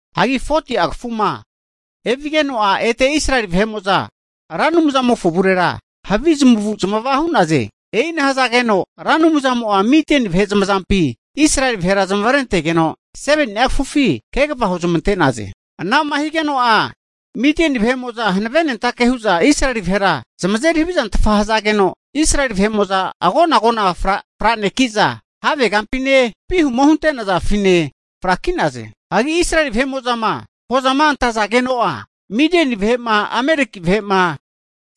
Hagi 40'a kafuma evigeno'a ete Israeli vahe'mo'za Ra Anumzamofo avurera havi zamavu'zamava hu'naze. E'ina hazageno'a Ra Anumzamo'a Midieni vahe zamazampi Israeli vahera zamavarentegeno, 7ni'a kafufi kegava huzmante'naze. Ana'ma higeno'a Midieni vahe'mo'za hanavenentake hu'za Israeli vahera zamazeri havizantfa hazageno, Israeli vahe'mo'za agona agona franeki'za, havegampine, vihuma hunte'nazafine fraki'naze. Hagi Israeli vahe'mo'zama hozama antazageno'a, Midieni vahe'ma, Ameleki vahe'ma,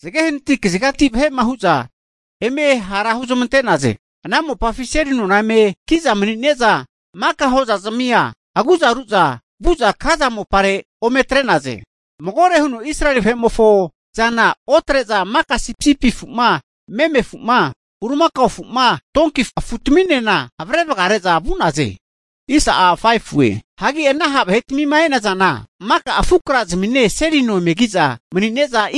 zage hanati kazigati vahe'ma hu'za eme hara huzamante'naze. Ana mopafi seli nona eme ki'za mani'ne'za maka hozazimia agu'za ru'za vu'za Gaza mopare ome atre'naze. Magore hu'za Israeli vahe'mofo zana otre'za maka sipisipi afu'ma, meme afu'ma, bulimakao afu'ma, Donki afutaminena avre vagare'za vu'naze. Hagi ana ha' vahetmima e'nazana, maka afu'krazmine seli nona eme ki'za mani'ne'za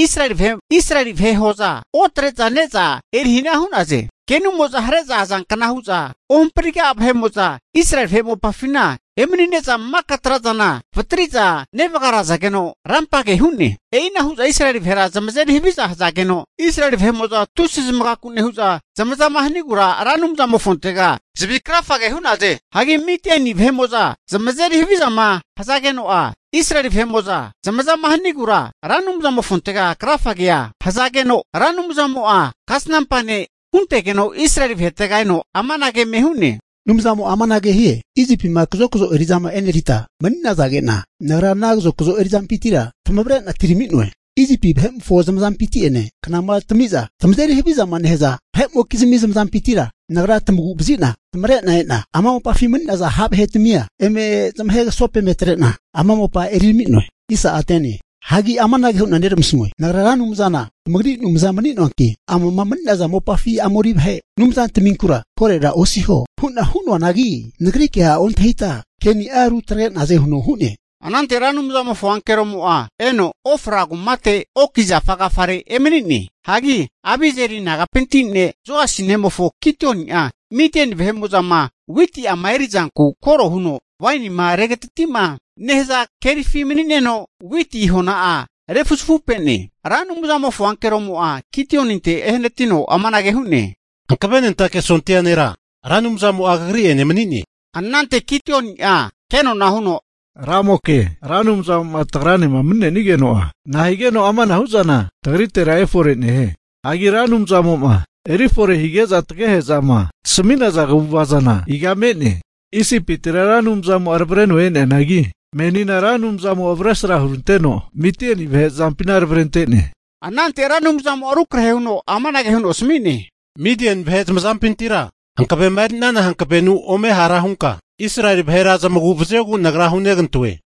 Israeli vahe hoza otre'za ne'za eri hana hu'naze. Kenumo'za hare'za azankna hu'za ohampriga'a vahe'mo'za Israeli vahe mopafina emanine'za maka tra'zana vatri'za nevagarazageno rampa'age hu'ne. E'ina hu'za Israeli vahera zamazeri haviza hazage'za, Israeli vahe'mo'za tusi zamagaku nehu'za zamazama hinogura Ra Anumzamofontega zavi krafage hu'naze. Hagi Midieni vahe'mo'zama zamazeri havizama hazageno'a Israeli vahe'mo'za zamazama hanigura Ra Anumzamofontega krafagea hazageno, Ra Anumzamo'a kasanampa ne' huntegeno Israeli vahetega eno amanage eme hu'ne, Ra Anumzana Israeli vahe Anumzamo'a amanage hie, Isipima kazokzo eri'zama e'nerita mani'nazage'na, Nagra ana kazokzo erizampintira tamavre'na atirami'noe. Isipi vahe'mofo zamazampinti'ene knama tamiza tamazeri havizama nehaza vahe'mokizmi zamazampintira Nagra tamagura vazi'na tamavre'na e'na ama mopafima mani'naza ha' vahetimia eme zamahe kasopenetre'na, ama mopa eri tami'noe. Hagi amanage hu'na neramasamue, Nagra Ra Anumzana tamagri Anumza mani'noanki, ama mani'naza mopafi Amori vahe anumzantaminkura korora osiho hu'na hu'noanagi, Nagri kea ontahita ke'ni'a rutagre'naze huno hu'ne. Anante Ra Anumzamofo ankeromo'a eno, Ofra kumate oki zafa agafare emani'ne. Hagi Abiezeri nagapinti ne' Joasi nemofo Gidioni'a Midieni vahe'mo'zama witi'ama erizanku koro huno wainima regatati'ma nehaza kerifi mani'neno, witi hona'a refuzafupe'ne. Ra Anumzamofo ankeromo'a Gidioninte ehanatino amanage hu'ne. Hankavenentake sondia nera, Ra Anumzamo'a kagri'ene mani'ne. Anante Gidioni'a kenona huno, ramoke, Ra Anumzamo'ma tagranema mani'negeno'a nahigeno amanahu zana tagritera efore nehie? Hagi Ra Anumzamo'ma erifore hige'za tagehe'zama tasami'naza kaguva zana iga me'ne? Isipitira Ra Anumzamo'a tavreno e'neanangi, menina Ra Anumzamo'a avresra huranteno Midieni vahe zamazampintira tavrente'ne. Anante Ra Anumzamo'a rukrahe huno amanage huno asami'ne, Midieni vahe zamazampintira hankavema eri'nana hankavenu ome ha' hunka Israeli vahera zamagu'vaziogu Nagra hunegantoe.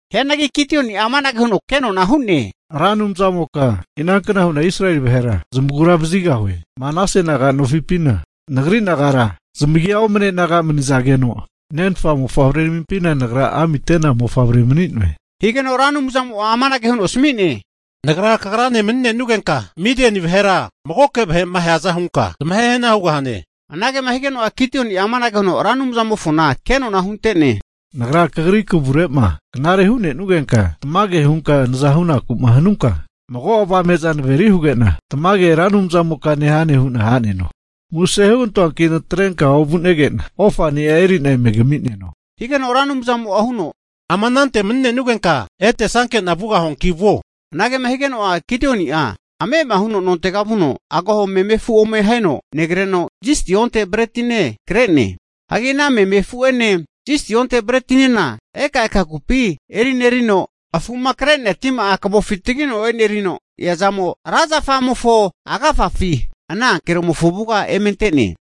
Hianagi Gidioni'a amanage huno kenona hu'ne, Ra Anumzamoka, inankna hu'na Israeli vahera zamagura vazigahue? Manase naga'nofipina nagri nagara zamigi omane naga'manizageno, nenfa mofavreramimpina nagra amite'na mofavre mani'noe. Higeno Ra Anumzamo'a amanage huno asami'ne, Nagra kagrane mani'nenugenka, Midieni vahera magoke vahe'ma aheaza hunka zamahehana hugahane. Anagema higeno'a Gidioni'a amanage huno Ra Anumzamofona kenona hunte'ne, Nagra kagri kavurema knare'ma hu'nenugenka tamage hunka nazama hunaku'ma hanunka, mago avame'za naveri huge'na tamage Ra Anumzamoka nehane hu'na ha'neno. Muse hugantoanki natrenka ovunege'na ofani'a eri'na eme kami'neno, higeno Ra Anumzamo'a huno, ama anante mani'nenugenka etesanke'na vugahuanki vuo. Anage'ma higeno'a Gidioni'a ame'ama huno nontega vuno, agaho meme afu ome aheno negreno, zisti onte bretine kre'ne. Hagi ana meme afu'ene zisti onte bretinena ekaeka kupi erinerino afu'ma kre'nea tima'a kavofi tagino e'nerino eazamo ra zafamofo agafafi ana ankeromofo avuga eme ante'ne.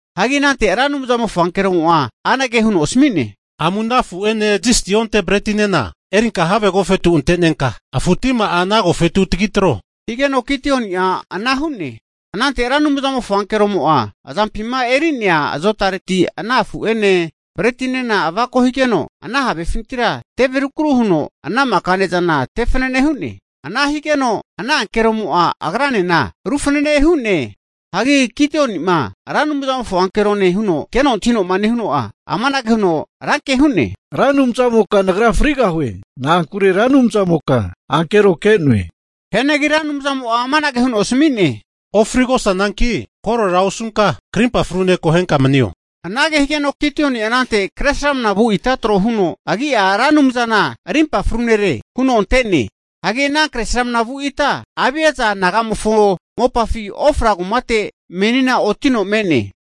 Hagi anante Ra Anumzamofo ankeromo'a anage huno asmi'ne, Amu ana afu'ene zisti onte bretinena erinka have agofetu ante'nenka afu tima'a ana agofetu tagitro, higeno Gidioni'a ana hu'ne. Anante Ra Anumzamofo ankeromo'a azampima eri'nea azotareti ana afu'ene bretinena avako higeno, ana havefintira teve rukru huno ana maka ne'zana tefanane hu'ne. Ana higeno ana ankeromo'a agranena rufanane hu'ne. Hagi Gidioni'ma Ra Anumzamofo ankerone huno keno antahinoma nehuno'a, amanage huno ran ke hu'ne, Ra Anumzamoka nagra frigahue! Na'ankure Ra Anumzamoka ankero ke'noe. Hianagi Ra Anumzamo'a amanage huno asmi'ne, ofrigosananki korora osunka krimpa frune akohenka manio. Anage higeno Gidioni'a anante kresramna vu ita tro huno agi'a Ra Anumzana Rimpa Fru Nere (Yawe-Shalom) huno ante'ne. Hagi ana kresramna vu ita Abiesa nagamofo mopafi Ofra kumate menina otino me'ne.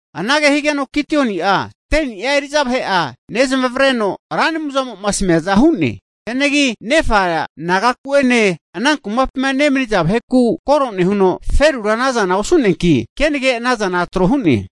Anage higeno Gidioni'a 10ni'a eri'za vahe'a nezamavreno Ra Anumzmo'ma asamiaza hu'ne. Hianagi nefa nagaku'ene ana kumapima nemaniza vaheku koro nehuno ferura anazana osu'neanki, kenage ana zana tro hu'ne.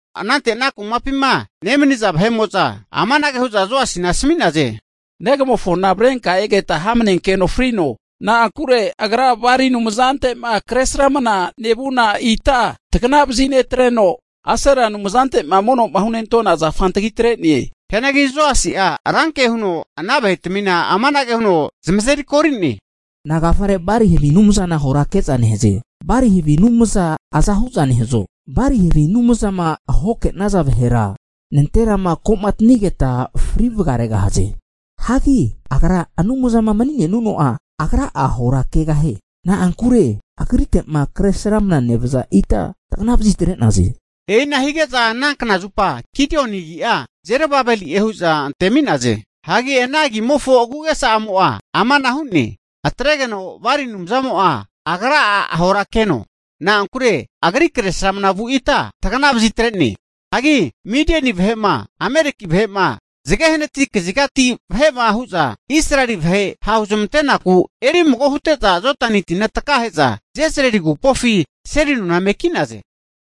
Anante ana kumapima nemaniza vahe'mo'za amanage hu'za Joasina asami'naze, Negamofona avrenka egeta ahamanenkeno frino. Na'ankure agra Bali anumzante'ma kresramna nevuna ita tagnavazi netreno, Asera anumzante'ma mono'ma hunentona zafa antagi tre'ne. Hianagi Joasi'a ranke huno ana vahetmina amanage huno zamazerikori'ne, Nagafare Bali havi anumzana ahora nekaze? Bali havi anumza aza hu'za nehazo? Bali havi anumzama ahomake'naza vahera nanterama komatinigeta fri vagaregahaze. Hagi agra anumzama mani'nenuno'a, agra'a ahora kegahie. Na'ankure agrite'ma kresramnama nevaza ita tagana vazitre'naze. E'ina hige'za ana knazupa Gidioni agi'a Jerub-bali'e hu'za antemi'naze. Hagi ana agimofo aguagesa'amo'a amana hu'ne, atregeno Bali anumzamo'a agra'a ahora keno, na'ankure agri Kresramana vu ita tagana vazitre'ne. Hagi Midieni vahe'ma, Ameleki vahe'ma zagehanati kazigati vahe'ma hu'za, Israeli vahe ha'huzamante'naku erimago hute'za Jodani tina takahe'za Jezril agupofi seli nona eme ki'naze.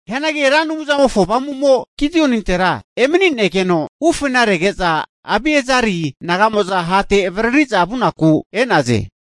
Hianagi Ra Anumzamofo Avamu'mo Gidionintera emani'negeno ufena rege'za, Abieseli naga'mo'za hate avaririza vu'naku e'naze.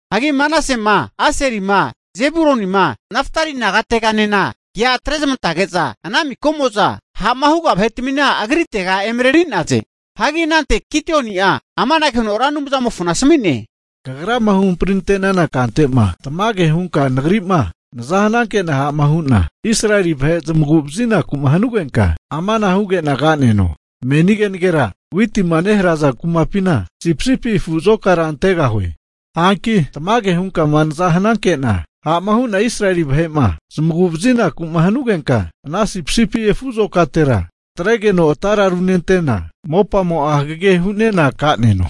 Hagi Manasema, Aserima, Zebulonima, Naftali nagateganena kea atrezamantage'za ana makamo'za ha'ma huga vahetamina agritega emareri'naze. Hagi anante Gidioni'a amanage huno Ra Anumzamofona asami'ne, Kagrama huhamprinante'nana kante'ma tamage hunka nagri'ma naza hanankena ha'ma hu'na Israeli vahe'ma zamaguvazinaku'ma hanugenka, amana huge'na ka'neno. Meni kenagera witima neharaza kumapina sipisipi afu azokara antegahue. Hanki tamage hunkama naza hananke'na ha'ma hu'na Israeli vahe'ma zamagu'vazinaku hanugenka, ana sipisipi afu azokatera atregeno atara runentena, mopamo'a hagege hu'nena ka'neno.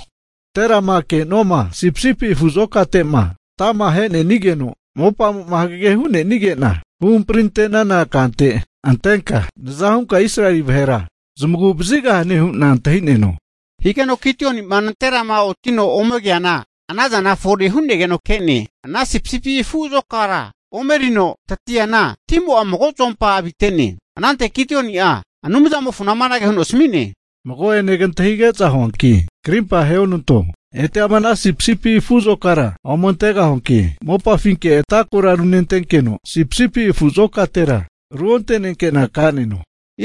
Nanterama ke'nuama sipisipi afu azokate'ma ata'ma ahenenigeno mopamo'ma hagagema hunenige'na, huhamprinante'nana kante antenka naza hunka Israeli vahera zamagu vazigahane hu'na antahi'neno. Hagi Gidioni'ma nanterama otino ome keana anaza fore hu'negeno ke'ne. Ana Sipisipi afu azokara omerino tatiana, timo'a mago zuompa avite'ne. Anante Gidioni'a Anumzamofona amanage huno asami'ne, Mago'ene kantahige'za huanki krimpa aheonanto. Ete ama ana sipisipi afu azokara ome antegahuanki, mopafinke ata kora runentenkeno, sipisipi afu azokatera ruontenke'na ka'neno.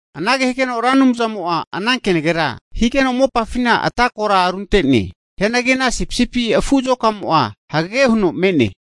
Anage higeno Ra Anumzamo'a ana kenagera higeno mopafina ata kora runte'ne. Hianagi ana sipisipi afu azokamo'a hagage huno me'ne.